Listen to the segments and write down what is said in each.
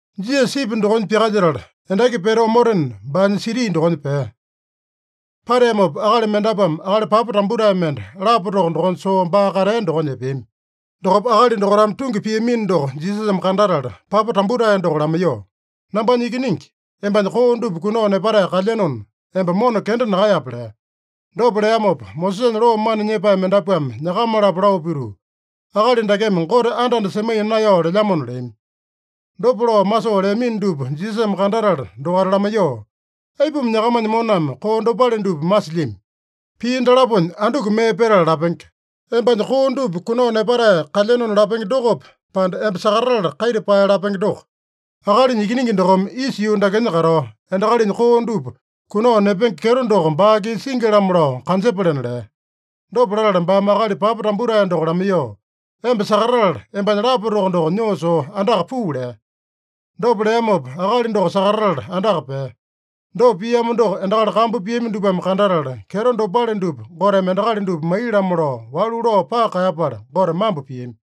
Jisasa sipi dokonya pyakalyetala, endaki pete omotena, baanya siti dokonya pea. Pateamopa, akali mendapuame akali papa tambutae mende lapa toko dokonya soo baa katea dokonya epeami. Dokopa akali dokaitame tungi piamino doko Jisasame kandatala, papa tambutae doko lamaiyoo, “Nambanya ikiningi, embanya koo dupa kunao nepatae kalyenona, emba mona kenda nakaeyape” lea. Dopa leamopa, Mosesanya loo mana nyepae mendapuame nyakama-lapo lao pituu, “Akali dakeme Gote anda-anda semaiya naeyao lelyamona” leami. Dopa lao masoo leamino dupa Jisasame kandatala dokaita lamaiyoo, “Aipuma nyakamanya moname koo dopale dupa masilyami? Pii dalaponya anduku mee petala lapenge? ‘Embanya koo dupa kunao nepatae kalyenona’ lapenge dokope, pande, ‘Emba sakatatala kaita pae’ lapenge doko? Akalinya Ikiningi dokome isa yuu dakenya katao, endakalinya koo dupa kunao nepenge kyeto doko baa-kisa singi-lamo lao kanjepalena” lea. Dopa latala baame akali papa tambutae doko lamaiyoo, “Emba sakatatala, embanya lapa toko doko nyoo soo andaka puu” lea. Dopa leamopa akali doko sakatatala andaka pea. Dopa piamo doko endakali kambu piami dupame kandatala, kyeto dopale dupa Goteme endakali dupa maiya-lamo lao walu lao paka kaeyapala, Gote mambo piami.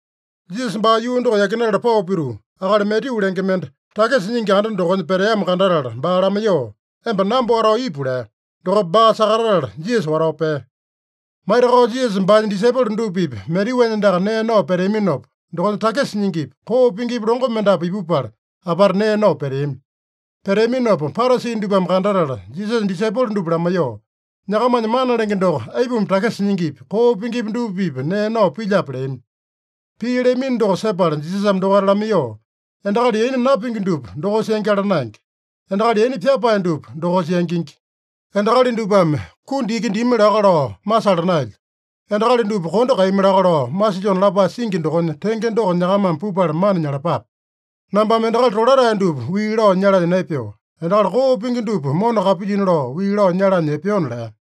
Jisasa baa yuu doko yakinatala pao pituu, akali Matyu lenge mende, takisa nyingi anda dokonya peteamo kandatala baa lamaiyoo, “Emba namba watao ipu” lea. Dokopa baa sakatatala Jisasa watao pea. Maitakao Jisasa baanya disaipolo dupa-pipa Matyuanya andaka nee nao peteaminopa, dokonya takisa nyingipi, koo pingipi longo mendapu ipupala, apata nee nao peteami. Peteaminopa Parasi dupame kandatala, Jisasanya disaipolo dupa lamaiyoo, “Nyakamanya mana lenge doko aipuma takisa nyingipi, koo pingipi dupa-pipa nee nao pilyape?” leami. Pii leamino doko sepala Jisasame dokaita lamaiyoo, “Endakali yaina napingi dupa dokosa yangyala naenge. Endakali yaina pyapae dupa dokosa yangingi. ‘Endakali dupame kundi iki dimi laka lao masala naelyo. Endakali dupa kondo kaeyami laka lao masilyona’ lapae singi dokonya tenge doko nyakamame pupala mana nyalapape. Nambame endakali tolatae dupa wii lao nyalanya naepeo. Endakali koo pingi dupa mona kapilyina lao, wii lao nyalanya epeona” lea.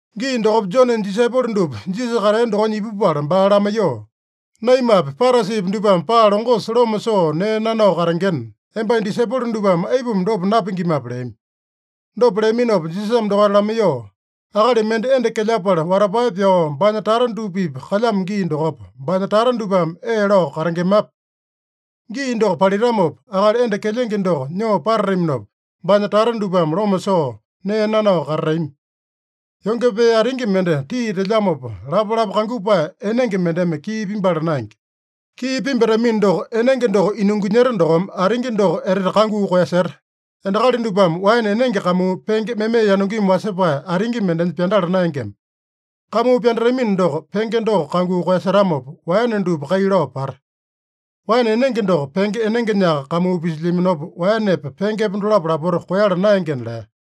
Gii dokopa Jonenya disaipolo dupa Jisasa katea dokonya ipupala baa lamaiyoo, “Naimapi, Parasipi dupame paa longosa loma soo nee nanao katengena, embanya disaipolo dupame aipuma dopa napingimape?” leami. Dopa leaminopa Jisasame dokaita lamaiyoo, “Akali mende enda kelyapala watapae pyao, baanya tata dupa-pipa kalyamo gii dokopa, baanya tata dupame ee lao katengemape? Gii doko palitamopa, akali enda kelyenge doko nyoo patataminopa, baanya tata dupame loma soo nee nanao katatami. Yonge pee atingi mende tii telyamopa, lapalapa kangupae enenge mendeme kii pimbala naenge. Kii pimbatamino doko, enenge doko inungunyeta dokome, atingi doko etete kanguu koeyaseta. Endakali dupame waene enenge kamuu penge meme yanungimi wasepae atingi mendenya pyandala naengema. Kamuu pyandatamino doko, penge doko kanguu koeyasetamopa, waene dupa kai lao pata. Waene enenge doko penge enengenyaka kamuu pisilyaminopa, waenepa, pengepa dolapo lapota koeyala naengena” lea.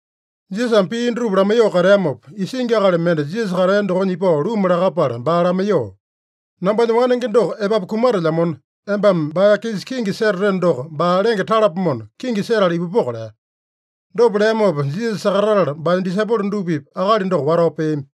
Jisasame pii dutupa lamaiyoo kateamopa, isingi akali mende Jisasa katea dokonya ipao luma lakapala, baa lamaiyoo, “Nambanya wanenge doko epapu kumatelyamona, embame baa-kisa kingi setateno doko, baa lenge talapomona, kingi setala ipupoko” lea. Dopa leamopa Jisasa sakatatala, baanya disaipolo dupa-pipa akali doko watao peami.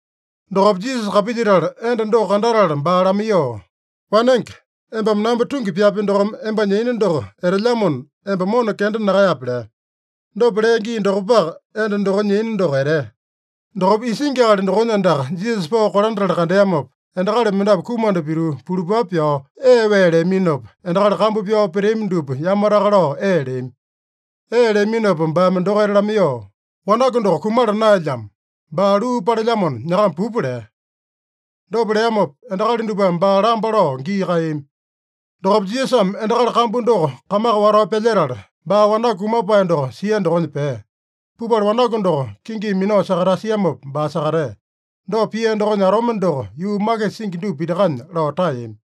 Dokopa Jisasa kapilyetala, enda doko kandatala baa lamaiyoo, “Wanenge, embame namba tungi pyapi dokome, embanya yaina doko etelyamona, emba mona kenda nakaeyape” lea. Dopa lea gii dokopaka, enda dokonya yaina doko etea. Dokopa isingi akali dokonya andaka Jisasa pao kolandatala kandeamopa, endakali mendapu kumanda pituu pulupapu pyao ee wee leaminopa, endakali kambu pyao peteami dupa yamataka lao ee leami. Ee leaminopa baame dokaita lamaiyoo, “Wanaku doko kumala naeyalamo. Baa luu palelyamona, nyakama pupa” lea. Dopa leamopa, endakali dupame baa lamba lao gii kaeyami. Dokopa Jisasame endakali kambu doko kamaka watao pyalyetala, baa wanaku kumapae doko sia dokonya pea. Pupala wanaku doko kinginya minao sakatasiamopa, baa sakatea. Dopa pia dokonya atome doko yuu makisa singi dupa pitakanya lao taeyami.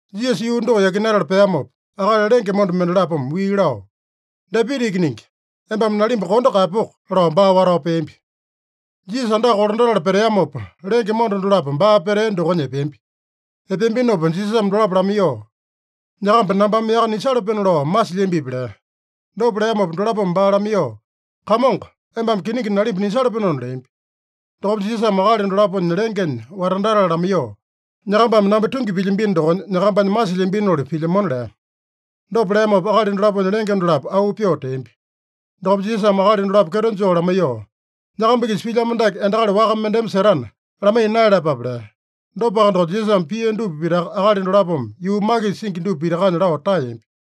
Jisasa yuu doko yakinatala peamopa, akali lenge monda mendalapome wii lao, “Dapita Ikiningi, embame nalimba kondo kaeyapoko!” lao baa watao peambi. Jisasa andaka kolandatala peteamopa, lenge monda dolapo baa petea dokonya epeambi. Epeambinopa Jisasame dolapo lamaiyoo, “Nyakamba nambame yaka nisalapenona lao masilyambipi?” lea. Dopa leamopa dolapome baa lamaiyoo, “Kamongo, embame kiningi nalimba nisalapenona” leambi. Dokopa Jisasame akali dolaponya lengenya watandatala lamaiyoo, “Nyakambame namba tungi pilyambino dokonya, nyakambanya masilyambinoli pilyamona” lea. Dopa leamopa akali dolaponya lenge dolapo auu pyoo teambi. Dokopa Jisasame akali dolapo kyeto joo lamaiyoo, “Nyakamba-kisa pilyamo dake endakali waka mendeme setana, lamaiya naeyalapape” lea. Dopaka doko, Jisasame pia dupa pitaka akali dolapome yuu makisa singi dupa pitakanya lao taeyambi.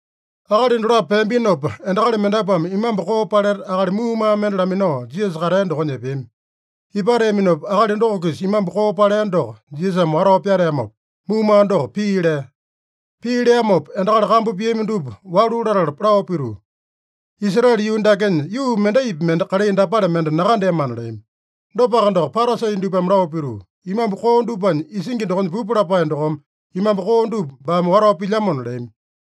Akali dolapo peambinopa, endakali mendapuame imambu koo paleta, akali muumaa mende laminao Jisasa katea dokonya epeami. Ipateaminopa, akali doko-kisa imambu koo palea doko Jisasame watao pyateamopa, muumaa doko pii lea. Pii leamopa, endakali kambu piami dupa walu latala lao pituu, “Israele yuu dakenya yuu mendaipi mende kalai dapale mende nakandeamana” leami. Dopaka doko, Parasi dupame lao pituu, “Imambu koo dupanya isingi dokonya pupu lapae dokome imambu koo dupa baame watao pilyamona” leami.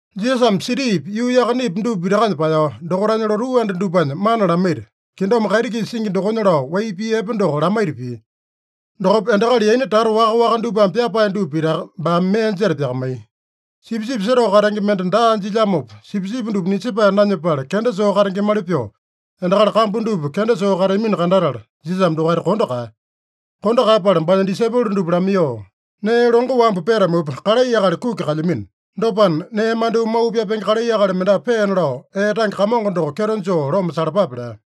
Jisasame sitipi, yuu yakanepi dupa pitakanya paeyao, dokaitanya lotuu anda dupanya mana lamaita, kingdom kaiti-kisa singi dokonya lao wai pii epe doko lamaita pia. Dokopa endakali yaina tata waka-waka dupame pyapae dupa pitaka baame mee jeta pyakamaiya. Sipisipi setao katenge mende daa jilyamopa, sipisipi dupa nisepae nanyepala kenda soo katengemali pyoo, endakali kambu dupa kenda soo kateamino kandatala, Jisasame dokaita kondo kaeya. Kondo kaeyapala baanya disaipolo dupa lamaiyoo, “Nee longo wambu petamupa, kalai akali kuki kalyamino. Dopana, nee mandyoo mau pyapenge kalai akali mendapu peena lao, ee tange Kamongo doko kyeto joo loma salapape” lea.